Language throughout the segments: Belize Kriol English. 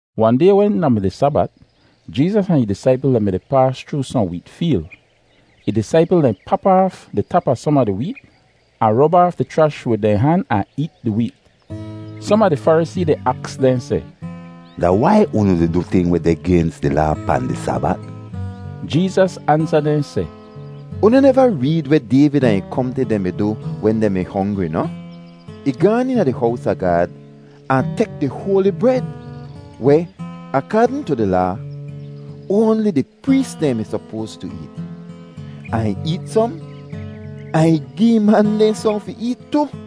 Wahn day wen da mi di Sabat, Jeezas ahn ih disaipl dehn mi-di paas chroo sohn weet feel. Ih disaipl dehn pap aaf di tap a som a di weet, ahn rob aaf di chrash wid dehn han ahn eet di weet. Som a di Farisee dehn aks dehn seh, “Da wai unu di du ting weh deh gens di Laa pahn di Sabat?” Jeezas ansa dehn seh, “Unu neva reed weh Dayvid ahn ih kompni dehn mi du wen dehn mi hongri noh? Ih gaan eena di hows a Gaad ahn tek di hoali bred weh, akaadn tu di Laa, oanli di prees dehn mi sopoas tu eet; ahn ih eet som ahn gi ih man dehn sohn fi eet tu.”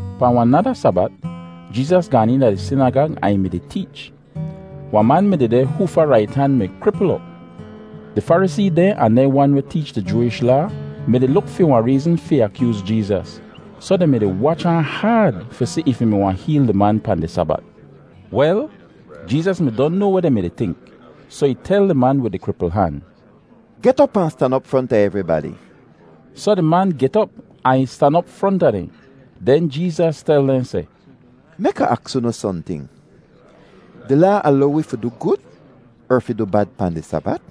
Pahn wahn nada Sabat, Jeezas gaan eena di sinagag ahn ih mi-di teech. Wahn man mi dehdeh hoofa rait han mi kripl op. Di Farisee dehn ahn dehn wan weh teech di Jooish Laa mi-di luk fi wahn reezn fi akyooz Jeezas, soh dehn mi-di wach ahn haad fi si if ih mi wahn heel di man pahn di Sabat. Wel, Jeezas mi don noa weh dehn mi-di tink, soh ih tel di man wid di kripl han, “Get op ahn stan op fronta evribadi.” Soh di man get op ahn ih stan op fronta dehn. Den Jeezas tel dehn seh, “Mek Ah aks unu sohnting. Di Laa alow wi fi du gud er fi du bad pahn di Sabat?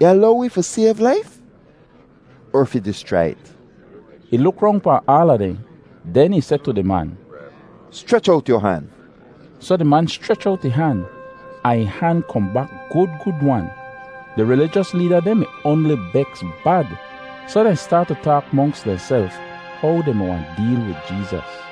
Ih alow wi fi sayv laif er fi dischrai it?” Ih luk rong pahn aala dehn. Den ih seh tu di man, “Schrech owt yu han.” Soh di man schrech owt ih han, ahn ih han kohn bak gud gud-wan! Di rilijos leeda dehn mi oanli beks bad. Soh dehn staat tu taak monks dehnself how dehn mi wahn deel wid Jeezas.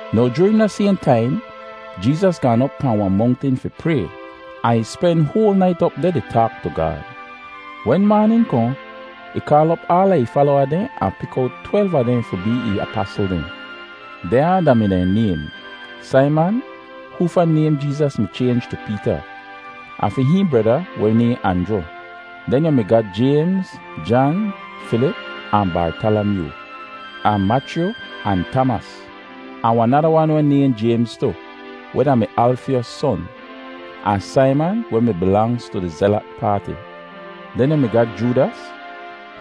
Now joorin da sayhn taim, Jeezas gaan op pahn wahn mongtin fi pray, ahn ih spen hoal nait op deh di taak tu Gaad. Wen maanin kohn, ih kaal op aala ih falowa dehn ahn pik owt twelv a dehn fi bee ih apasl dehn. Dehnya da-mi dehn naym: Saiman, hoofa naym Jeezas mi chaynj tu Peeta; ahn fi hihn breda, weh nayhn Anjru. Den yu mi ga Jaymz, Jan, Filip ahn Bartalamyoo; ahn Machyu ahn Tamas; ahn wahn nada wan weh nayhn Jaymz tu, weh da-mi Alfyos son; ahn Saiman weh mi bilangz tu di Zelat Paati. Den yu mi ga Joodas,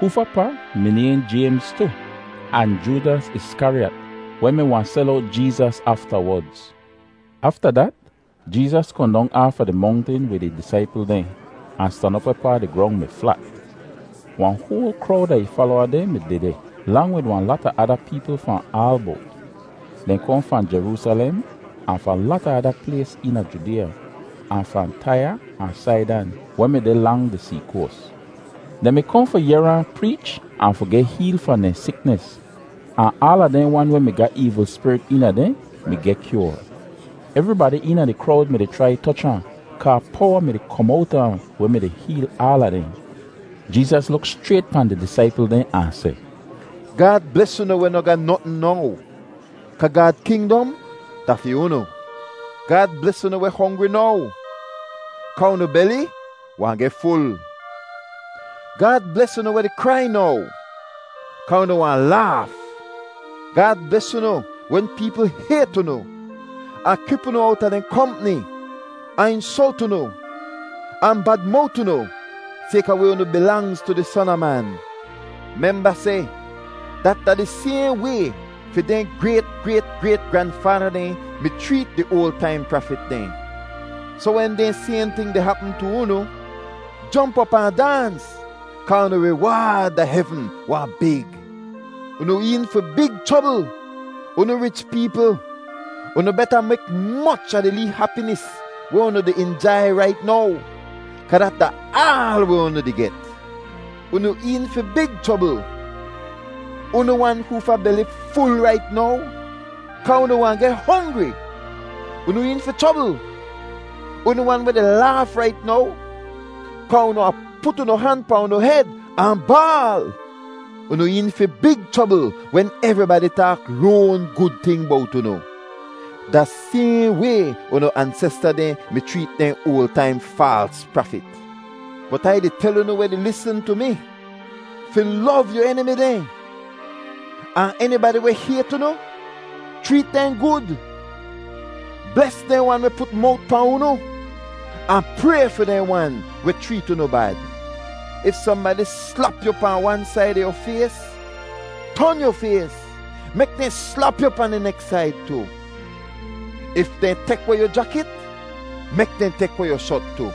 hoofa pa mi nayhn Jaymz tu, ahn Joodas Iskariyat, weh mi wahn sel owt Jeezas aftawodz. Afta dat Jeezas kohn dong aafa di mongtin wid ih disaipl dehn, ahn stan op wehpaa di grong mi flat. Wahn hoal krowd a ih falowa dehn mi dehdeh, lang wid wahn lata ada peepl fahn aal bowt. Dehn kohn fahn Jeroosalem, ahn fahn lata ada plays eena Judeeya, ahn fahn Taiya ahn Saidan, weh mi deh lang di see koas. Dehn mi kohn fi yehr ahn preech ahn fi geh heel fahn dehn siknis, ahn aala dehn wan weh mi ga eevl spirit eena dehn mi geh kyoar. Evribadi eena di krowd mi-di chrai toch ahn kaa powa mi-di kom owta ahn weh mi-di heel aala dehn. Jeezas luk schrayt pahn di disaipl dehn ahn seh, “Gaad bles unu weh noh ga notn now; kaa Gaad kingdom da fi unu. Gaad bles unu weh hongri now; kaa unu beli wahn geh ful. Gaad bles unu weh di krai now; kaa unu wahn laaf. Gaad bles unu wen peepl hayt unu, ahn kip unu owta dehn kompni ahn insolt unu, ahn bad-mowt unu sayka weh unu bilangz tu di Son a Man. “Memba seh dat da di sayhn way fi dehn grayt-grayt-grayt-granfaada dehn mi chreet di oal taim prafit dehn. Soh wen dehn sayhn ting deh hapm tu unu, jomp op ahn daans kaa unu riwaad da hevn wahn big. Unu een fi big chrobl, unu rich peepl. Unu beta mek moch a di lee hapinis weh unu di injai rait now, kaa dat da aal weh unu di get. Unu een fi big chrobl, unu wan hoofa beli ful rait now, kaa unu wahn geh hongri. Unu een fi chrobl, unu wan weh di laaf rait now, kaa unu wahn put unu han pahn unu hed ahn baal! Unu een fi big chrobl wen evribadi taak loan gud ting bowt unu! Da sayhn way unu ansesta dehn mi chreet dehn oal taim faals prafit. “Bot Ai di tel unu weh di lisn tu mi fi lov yu enimi dehn, ahn enibadi weh hayt unu, chreet dehn gud. Bles dehn wan weh put mowt pahn unu, ahn pray fi dehn wan weh chreet unu bad. If sohnbadi slap yu pahn wan said a yu fays, ton yu fays, mek dehn slap yu pahn di neks said tu. If dehn tek weh yu jakit, mek dehn tek weh yu shot tu.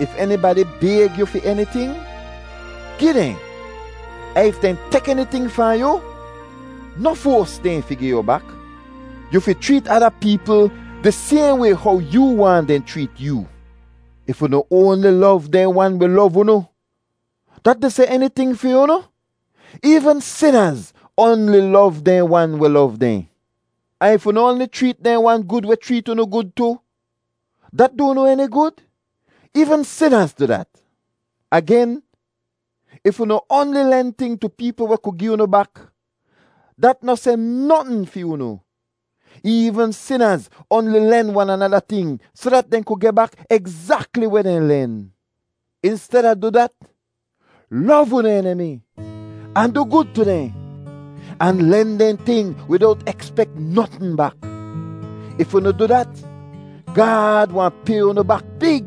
If enibadi bayg yu fi eniting, gi dehn, ahn if dehn tek eniting fahn yu, noh foas dehn fi gi yu bak. Yu fi chreet ada peepl di sayhn way how yoo waahn dehn chreet yoo. “If unu oanli lov dehn wan weh lov unu, dat di seh eniting fi unu? Eevn sinaz oanli lov dehn wan weh lov dehn. Ahn if unu oanli chreet dehn wan gud weh chreet unu gud tu, dat du unu eni gud? Eevn sinaz du dat. Agen, if unu oanli len ting tu peepl weh ku gi unu bak, dat noh seh notn fi unu. Eevn sinaz oanli len wan anada ting soh dat dehn ku geh bak egzakli weh dehn len. Insteda du dat, lov unu enimi ahn du gud tu dehn, ahn len dehn ting widowt ekspek notn bak. If unu du dat, Gaad wahn pay unu bak big,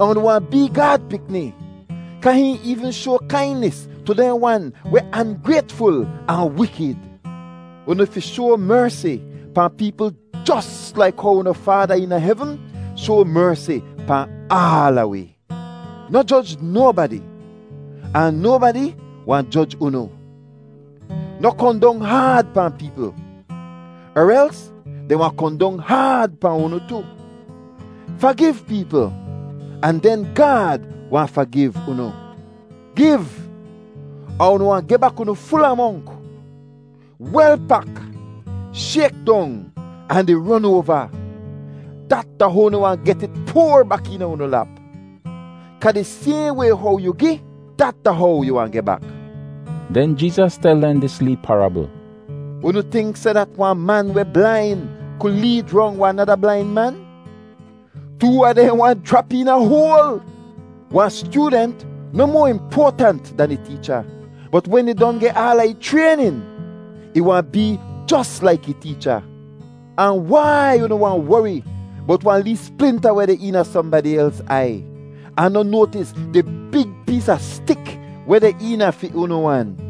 ahn unu wahn bee Gaad pikni kaa hihn eevn shoa kainis tu dehn wan weh angraytful ahn wikid. Unu fi shoa mersi pahn peepl jos laik how unu Faada eena hevn shoa mersi pahn aala wi. “Noh joj nobadi, ahn nobadi wahn joj unu. Noh kohn dong haad pahn peepl, er els dehn wahn kohn dong haad pahn unu tu. Fagiv peepl ahn den Gaad wahn fagiv unu. Giv, ahn unu wahn geh bak unu ful amonk, wel pak, shayk dong, ahn di ron oava. Dat da how unu wahn get it poar bak eena unu lap. Kaa di sayhn way how yu gi, dat da how yu wahn geh bak.” Den Jeezas tel dehn dis lee parabl: “Unu tink seh dat wahn man weh blain ku leed rong wahn nada blain man? Too a dehn wahn jrap eena hoal. Wahn styoodent noh moa impoatant dan ih teecha, bot wen ih don geh aala ih chraynin, ih wahn bee jos laik ih teecha. “Ahn wai unu wahn wori bowt wahn lee splinta weh deh eena sohnbadi els aiy, ahn noh noatis di big pees a stik weh deh eena fi unu wan?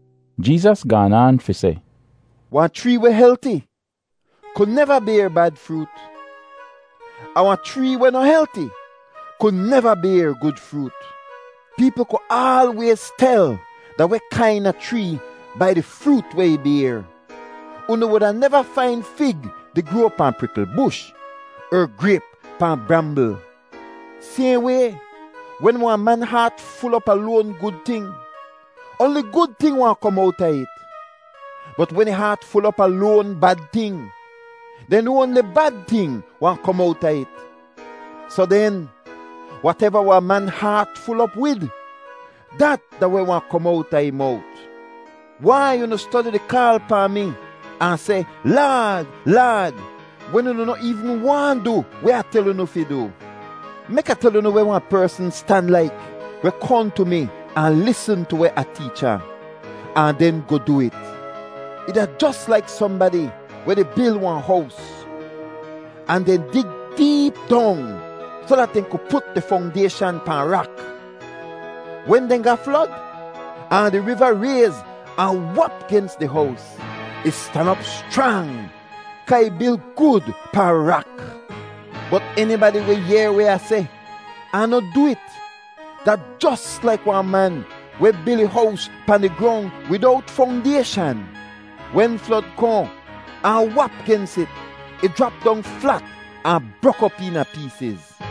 Jeezas gaan aan fi seh, “Wahn chree weh helti ku neva bayr bad froot, ahn wahn chree weh noh helti ku neva bayr gud froot. Peepl ku aalwayz tel da weh kaina chree bai di froot weh ih bayr. Unu wuda neva fain fig di groa pahn prikl bush, er grayp pahn brambl. Sayhn way, wen wahn man haat ful op a loan gud ting, oanli gud ting wahn kom owta it, bot wen ih haat ful op a loan bad ting, den oanli bad ting wahn kom owta it. Soh den, wateva wahn man haat ful op wid, dat da weh wahn kom owta ih mowt. “Wai unu stodi di kaal pahn mi ahn seh, ‘Laad, Laad’ wen unu noh eevn waahn du weh Ah tel unu fi du? Mek Ah tel unu weh wahn persn stan laik weh kohn tu mi ahn lisn tu weh Ah teech ahn, ahn den goh du it. Ih da jos laik sohnbadi weh di bil wahn hows, ahn dehn dig deep dong soh dat dehn ku put di fongdayshan pahn rak. Wen dehn ga flod ahn di riva rayz ahn wap gens di hows, ih stan op schrang kaa ih bil gud pahn rak. Bot enibadi weh yehr weh Ah seh ahn noh du it, da jos laik wahn man weh bil ih hows pahn di grong widowt fongdayshan. Wen flod kohn ahn wap gens it, ih jrap dong flat ahn brok op eena peesiz.”